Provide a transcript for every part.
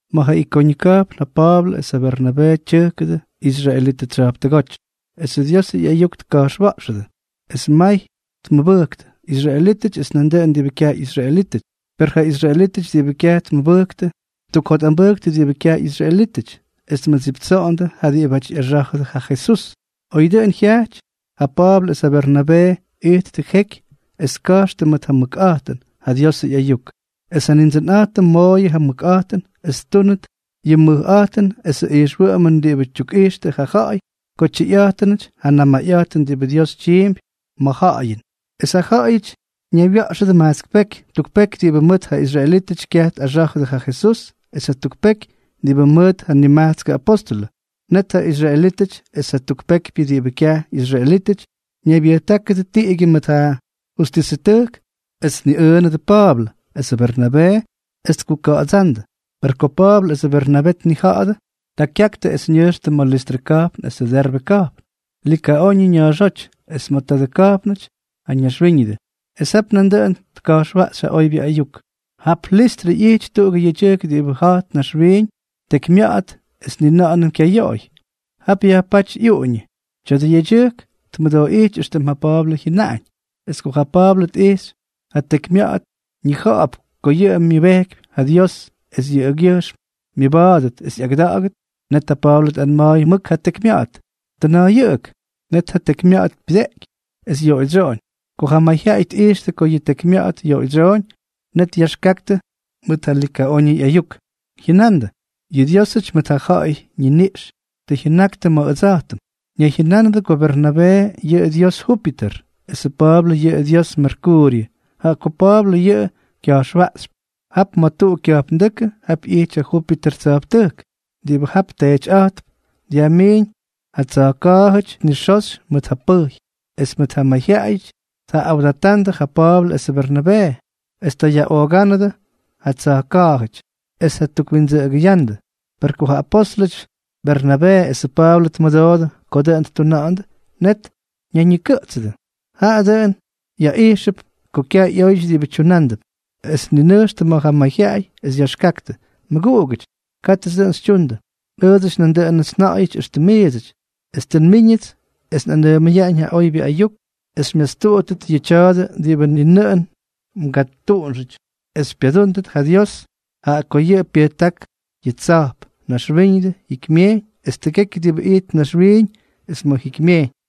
Ma̱ ja Ikoñʉ ka̱jpn ja Pa̱a̱blʉ es ja Bernabee tyʉjkʉdʉ israelitʉ tsya̱jptʉgóty, esʉ Diosʉ ꞌyayuk tka̱jxwa̱ꞌxʉdʉ. Es may tmʉbʉjktʉ, israelítʉty es nandʉꞌʉn diꞌibʉ kyaj ꞌyisraelítʉty. Per ja israelítʉty diꞌibʉ kyaj tmʉbʉjktʉ, ttukjotꞌambʉjktʉ diꞌibʉ kyaj ꞌyisraelítʉty, es tmʉdsiptsoꞌondʉ ja diꞌibáty ꞌyaxá̱jʉdʉ ja Jesús. Oy dʉꞌʉn jyajty, ja Pa̱a̱blʉ es ja Bernabee ijttʉ jeky es tka̱jxtʉ mʉt ja mʉkꞌa̱jtʉn ja Diosʉ ꞌyayuk; es ja Nindsʉnꞌa̱jtʉm mooyʉ ja mʉkꞌa̱jtʉn es ttúnʉt yʉ mʉjꞌa̱jtʉn esʉ ijxwʉꞌʉmʉn diꞌibʉ tyukꞌijxtʉ ja ja̱ꞌa̱y ko tyʉyꞌa̱jtʉnʉty ja namayꞌa̱jtʉn diꞌibʉ Dios tyiimpy ma̱ ja̱ꞌa̱yʉn. Es ja ja̱ꞌa̱yʉty ñaywya̱ꞌxʉdʉ majtsk peky: tuk peky diꞌibʉ mʉt ja israelítʉty kyaj tꞌaxá̱jʉdʉ ja Jesús, es jatuk peky diꞌibʉ mʉt ja nimajtskʉ apóstʉlʉ. Net ja israelítʉty es jatuk pekypyʉ diꞌibʉ kyaj ꞌyisraelítʉty, ñaybyʉjtákʉdʉ tiꞌigyʉ mʉt ja justisʉtʉjk es tniꞌʉꞌʉnʉdʉ ja Pa̱a̱blʉ esʉ Bernabee es tkuka̱ꞌa̱dsándʉ. Per ko Pa̱a̱blʉ esʉ Bernabee tnija̱ꞌa̱dʉ, ta kyaktʉ es ñʉjxtʉ ma̱ Listrʉ ka̱jpn esʉ Derbe ka̱jpn, Likaoñʉ ña̱a̱xóty, es ma̱ tadʉ ka̱jpnʉty ja ñaxwíñʉdʉ. Es jap nandʉꞌʉn tka̱jxwaꞌxy ja oybyʉ ayuk. Jap Listrʉ ꞌyijty tuꞌugʉ yedyʉjk diꞌibʉ ja̱jt naxwiiñ tekymya̱ꞌa̱t es ni na̱ꞌa̱nʉm kyaj yoꞌoy. Jap yajpáty ꞌyuꞌuñʉ. Tya̱dʉ yedyʉjk tmʉdooꞌíty éxtʉm ja Pa̱a̱blʉ jyʉnaꞌañ. Es ko ja Pa̱a̱blʉ tꞌijxy ja tekymya̱ꞌa̱t, ñija̱ꞌa̱p ko yʉꞌʉ myʉbejkypy ja Dios es yʉꞌʉgyʉjxm myʉba̱a̱dʉt es ꞌyagʉda̱ꞌa̱gʉt. Net ja Pa̱a̱blʉ tꞌanma̱a̱y mʉk ja tekymya̱ꞌa̱t: —¡Tʉna̱a̱yʉꞌʉk! Net ja tekymya̱ꞌa̱t pyʉjteꞌky, es yoꞌoydsyoꞌoñ. Ko ja mayjyaꞌayʉty tꞌijxtʉ ko ja tekymya̱ꞌa̱t yoꞌoydsyoꞌoñ, net yaxkaktʉ mʉt ja Likaoñʉ ꞌyayuk, jyʉnandʉ: —¡Yʉ diósʉty mʉt ja ja̱ꞌa̱yʉ ñiniꞌx tʉ jyʉnaktʉ ma̱ ʉdsa̱jtʉm! Ñayjyʉnánʉdʉ ko Bernabee yʉꞌʉ dios Júpiter, esʉ Pa̱a̱blʉ yʉꞌʉ dios Merkuuryʉ, jaꞌa ko Pa̱a̱blʉ yʉꞌʉ kya̱jxwaꞌxypy. Jap ma̱ tuꞌu kya̱jpndʉ́kʉ, jap ꞌyity ja Júpiter tsya̱jptʉjk. Diꞌibʉ jap teetyꞌa̱jtp dyajmiiñ ja tsa̱jka̱a̱jʉty nixoxy mʉt ja pʉjy, es mʉt ja mayjyaꞌayʉty tjaꞌꞌawdatandʉ ja Pa̱a̱blʉ esʉ Bernabee, es ta tjayaꞌoogándʉ ja tsa̱jka̱a̱jʉty es tjatukwindsʉꞌʉgʉyándʉ. Per ko ja apóstʉlʉty Bernabee esʉ Pa̱a̱blʉ tmʉdoodʉ ko dʉꞌʉn ttuna̱ꞌa̱ndʉ, net ñayñikʉꞌtsʉdʉ. Jaꞌa dʉꞌʉn yaꞌijxʉp ko kyaj ꞌyóyʉty diꞌibʉ tyunándʉp. Es tninʉjxtʉ ma̱ ja mayjyaꞌay, es yaxkaktʉ: —Mʉguꞌugʉty, kátʉts dʉꞌʉn xytyundʉ. Ʉʉdsʉty nandʉꞌʉnʉts nja̱ꞌa̱yʉty éxtʉm miidsʉty, es tʉ nmíñʉts es nꞌanʉʉmʉyaꞌañ ja oybyʉ ayuk es xymyastuꞌuttʉt yʉ tya̱a̱dʉ diꞌibʉ ni nʉꞌʉn mgatuꞌunxʉty, es xypyadúndʉt ja Dios, jaꞌa ko yʉꞌʉ pyʉjták yʉ tsa̱jp, naxwíñʉdʉ, jikymyejyñ es tʉgekyʉ diꞌibʉ ijtp naxwiiñ es ma̱ jikymyejyñ.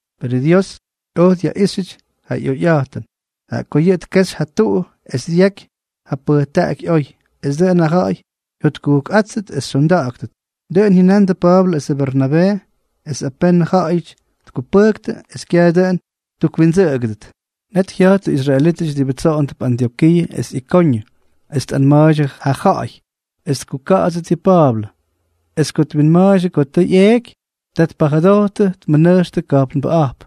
Perʉ Dios oj dyaꞌíxyʉty ja ꞌyoyꞌa̱jtʉn, jaꞌa ko yʉꞌʉ tkexy ja tuu es dyaky ja pʉjtaꞌaky oy, es dʉꞌʉn ja ja̱ꞌa̱y jyotkujkꞌáttʉt es xyonda̱ꞌa̱ktʉt. Dʉꞌʉn jyʉnandʉ Pa̱a̱blʉ esʉ Bernabee, es apenʉ ja̱ꞌa̱yʉty tkupʉjktʉ es kyaj dʉꞌʉn ttukwindsʉꞌʉgʉdʉt. Net jya̱jttʉ israelítʉty diꞌibʉ tsoꞌondʉp Antyokiiʉ es Ikoñʉ, es tꞌanma̱a̱ydyʉ ja ja̱ꞌa̱y es tkuka̱ꞌa̱tstʉt yʉ Pa̱a̱blʉ. Es ko twinma̱a̱ydyʉ ko tʉ ꞌyeeky, ta tpajʉdojttʉ tmʉnʉjxtʉ ka̱jpnbʉꞌa̱jp.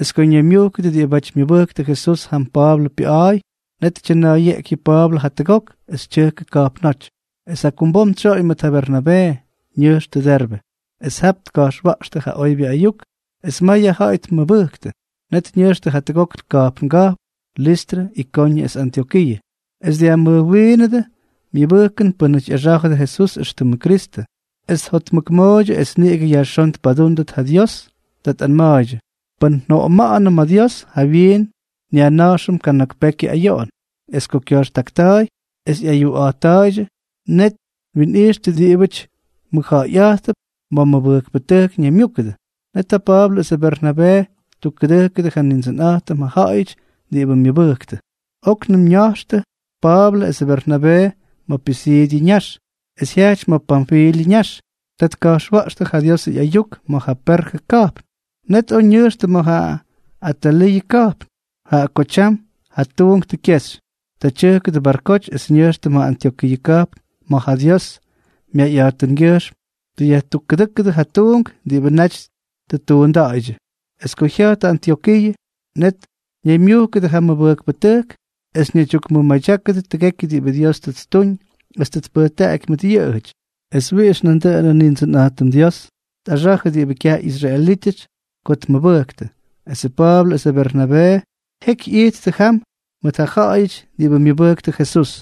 Es ko ñaymyujkʉdʉ diꞌibáty myʉbʉjktʉ Jesús jam Pa̱a̱blʉ pyʉꞌa̱a̱y, net tyʉna̱a̱yeꞌky yʉ Pa̱a̱blʉ jatʉgok es tyʉjkʉ ka̱jpnóty. Es jakumbom tsyoꞌoñ mʉt ja Bernabee, ñʉjxtʉ Derbe. Es jap tka̱jxwa̱ꞌxtʉ ja oybyʉ ayuk, es may ja ja̱ꞌa̱y tmʉbʉjktʉ. Net ñʉjxtʉ jatʉgok ka̱jpnga̱jpn, Listrʉ, Ikoñʉ es Antyokiiʉ. Es dyajmʉjwiinʉdʉ myʉbʉjkʉn pʉ́nʉty ꞌyaxá̱jʉdʉ Jesús éxtʉmʉ Kristʉ, es tjotmʉkmooydyʉ es niꞌigʉ yajxón tpadúndʉt ja Dios. Ta tꞌanma̱a̱ydyʉ: “Pʉn njoꞌoma̱ꞌa̱nʉm ma̱ Dios, jawyiin nyajna̱jxʉm kana̱k pekyʉ ayoꞌon.” Es ko kya̱jxtakta̱a̱y es ꞌyayuꞌa̱jtta̱a̱ydyʉ, net twinꞌijxtʉ diꞌibʉty mʉjja̱ꞌa̱yꞌa̱jttʉp ma̱ mʉbʉjkpʉtʉjk ñaymyúkʉdʉ. Net ja Pa̱a̱blʉ esʉ Bernabee ttukkʉdʉjkʉdʉ ja Nindsʉnꞌa̱jtʉm ja ja̱ꞌa̱yʉty diꞌibʉ myʉbʉjktʉ. Oknʉm ña̱jxtʉ Pa̱a̱blʉ esʉ Bernabee ma̱ Pisiidyʉ ñax, es jyajty ma̱ Panfilyʉ ñax. Ta tka̱jxwa̱ꞌxtʉ ja Diosʉ ꞌyayuk ma̱ ja Perjʉ ka̱jpn. Net oj ñʉjxtʉ ma̱ ja Ataliiʉ ka̱jpn. Jaꞌa ko tyam ja tuunk tʉ kyexy, ta tyʉjkʉdʉ barkoty es ñʉjxtʉ ma̱ Antyokiiʉ ka̱jpn, ma̱ ja Dios myayꞌa̱jtʉngyʉjxm tʉ yajtukkʉdʉ́kʉdʉ ja tuunk diꞌibʉ naty tʉ ttuunda̱ꞌa̱ydyʉ. Es ko jya̱jttʉ Antyokiiʉ, net ñaymyujkʉdʉ ja mʉbʉjkpʉtʉjk es ñaydyukmʉmadyákʉdʉ tʉgekyʉ diꞌibʉ Dios tʉ ttuñ es tpʉjtaꞌaky mʉt yʉꞌʉjʉty, es wiꞌix nandʉꞌʉnʉ Nindsʉnꞌa̱jtʉm Dios tꞌaxa̱jʉ diꞌibʉ kyaj ꞌyisraelítʉty ko tmʉbʉktʉ. Esʉ Pa̱a̱blʉ esʉ Bernabee jeky ꞌyijttʉ jam mʉʉt ja ja̱ꞌa̱yʉty diꞌibʉ myʉbʉjktʉ Jesús.